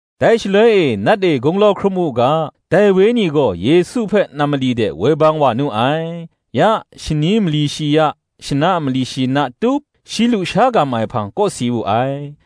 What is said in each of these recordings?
Dai shaloi e, Nat e gunglau hkrum u ga, dai Wenyi gaw Yesu hpe nam mali de woi bang wa nu ai. Ya shani mali shi ya, shana mali shi na tup, shi lusha gam ai hpang kawsi wu ai.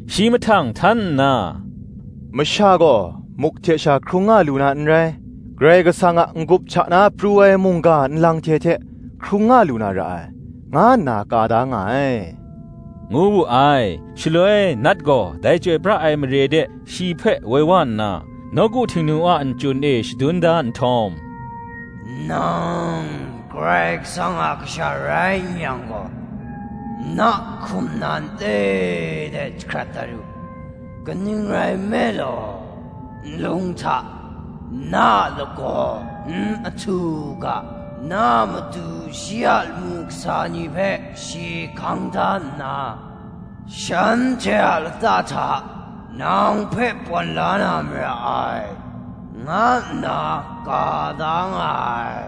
Shi mahtang htan nna, “Masha gaw, muk hte sha hkrung nga lu na n rai; Karai Kasang a n-gup hta na pru ai mungga nlang hte hte hkrung nga lu na ra ai, nga nna ka da nga ai,” ngu wu ai. Shaloi Nat gaw dai chyoi pra ai mare de, shi hpe woi wa nna, nawku Htingnu a nchyun e shadun da nhtawm, “Nang Karai Kasang a Kasha rai n yang gaw, na hkum nan le de jahkrat dat u: kaning rai nme law, Nlung hta, na a lagaw n ahtu u ga, Na a matu shi a lamu kasa ni hpe shi hkang da nna, Shanhte a lata hta, nang hpe pawn la na mara ai, nga nna ka da nga ai,”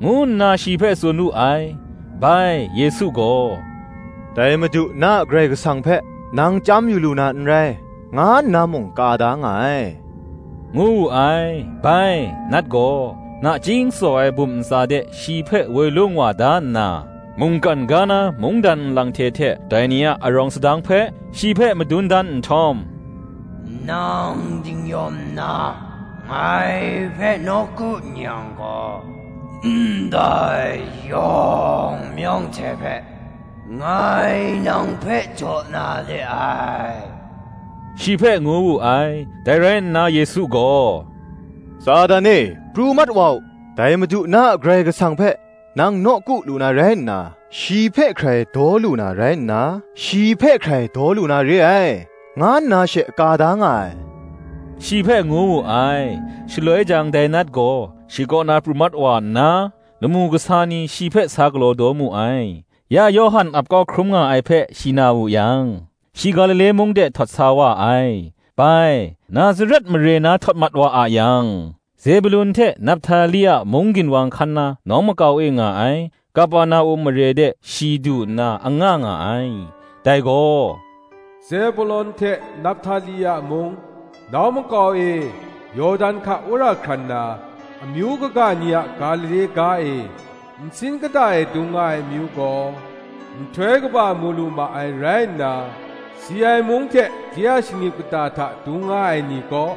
ngu nna shi hpe tsun wu ai. Bai, Yesu gaw, “Dai Madu, na a Karai Kasang hpe nang chyam yu lu na n rai, nga nna mung ka da nga ai,” ngu wu ai. Bai, Nat gaw, nachying tsaw ai bum ntsa de shi hpe woi lung wa da nna, mungkan ga na mungdan nlang hte hte dai ni a arawng sadang hpe, shi hpe madun dan nhtawm, “Nang dingnyawm nna ngai hpe nawku n yang gaw, ndai yawng mayawng hte hpe ngai nang hpe jaw na de ai,” shi hpe ngu wu ai. Dai rai nna Yesu gaw, “Satan e, pru mat wa u; dai Madu, na a Karai Kasang hpe nang nawku lu na rai nna, shi hpe hkrai daw lu na re ai,” nga nna she ka da nga ai shi hpe ngu wu ai. Shaloi jang dai Nat gaw shi kaw na pru mat wa nna, lamu kasa ni shi hpe sa galaw daw mu ai. Ya Yawhan ap kau ai hkrum nga ai hpe shi na wu yang, shi Galile mung de htawt sa wa ai: bai. Nazaret mare na htawt mat wa a yang, Zebulon hte Naphtali a mung ginwang hkan na nawng makau e nga ai Kaperna-um mare de shi du nna anga nga ai. Dai gaw, Zebulon hte Naphtali a mung, “Nawng makau e, Yawdan hka wora hkran na, Amyu kaga ni a Galile ga e; Nsin kata e dung nga ai amyu gaw, Nhtoi kaba mu lu ma ai rai nna, Si ai mung hte de a shingnip kata hta dung nga ai ni kaw,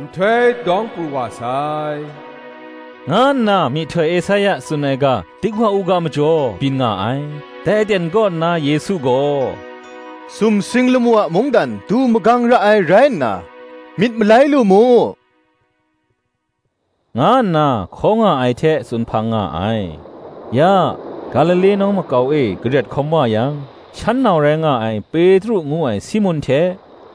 Nhtoi dawng pru wa sai,” nga nna myihtoi Esaia tsun ai ga dik wa u ga majaw byin nga ai. Dai aten kaw nna Yesu gaw, “Sumsing lamu a mungdan du magang ra ai rai nna, myit malai lu mu,” nga nna hkaw nga ai hte tsun hpang nga ai. Ya, Galile nawng makau e garet hkawm wa yang, shan nau rai nga ai Petru ngu ai Simun hte,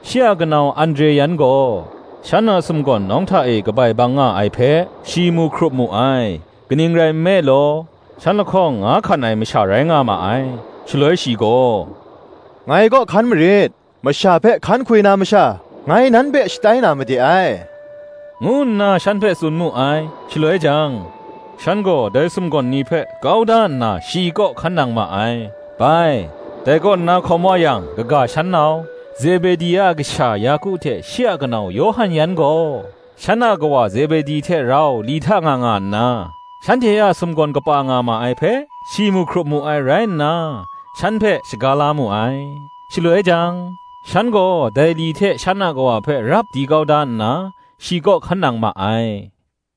shi a kanau Andre yan gaw, shan a sumgawn nawng hta e kabai bang nga ai hpe, shi mu hkrup mu ai: kaning rai nme law, shan lahkawng nga hkan ai masha rai nga ma ai: Shaloi shi gaw, “Ngai kaw hkan marit; masha hpe hkan hkwi na masha, ngai nan hpe shatai na made ai,” ngu nna shan hpe tsun mu ai. Shaloi jang, shan gaw dai sumgawn ni hpe kau da nna shi kaw hkan nang ma ai. Bai, dai kaw na hkawm wa yang, kaga shan nau, Zebedi a kasha Yaku hte shi a kanau Yawhan yan gaw, shan a kawa Zebedi hte rau li hta nga nga nna, shanhte a sumgawn kapa nga ma ai hpe, shi mu hkrup mu ai rai nna, shan hpe shaga la mu ai. Shaloi jang, shan gaw dai li hte shan a kawa hpe rap di kau da nna, shi kaw hkan nang ma ai.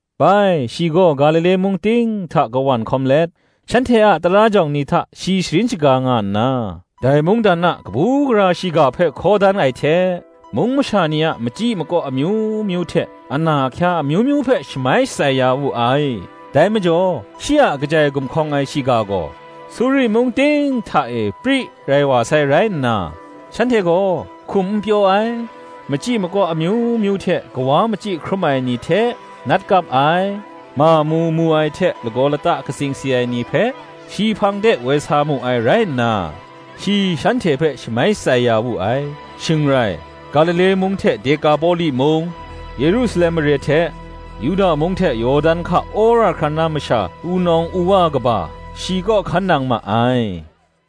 Bai, shi gaw Galile mung ting hta kawan hkawm let, shanhte a tara jawng ni hta shi sharin shaga nga nna, dai mungdan a kabu gara shiga hpe hkaw dan ai hte, mung masha ni a machyi makaw amyu myu hte ana ahkya amyu myu hpe shamai shatsai ya wu ai. Dai majaw, shi a kajai gumhkawng ai shiga gaw, Suri mung ting hta e pri rai wa sai rai nna, shanhte gaw, hkum n pyaw ai, machyi makaw amyu myu hte kawa machyi hkrum ai ni hte, nat kap ai, mamu mu ai hte lagaw lata katsing si ai ni hpe shi hpang de woi sa mu ai rai nna, shi shanhte hpe shamai shatsai ya wu ai. Shing rai, Galile mung hte Dekapoli mung, Yerusalem mare hte Yuda mung hte Yawdan hka wora hkran na masha wunawng wuwa kaba shi kaw hkan nang ma ai.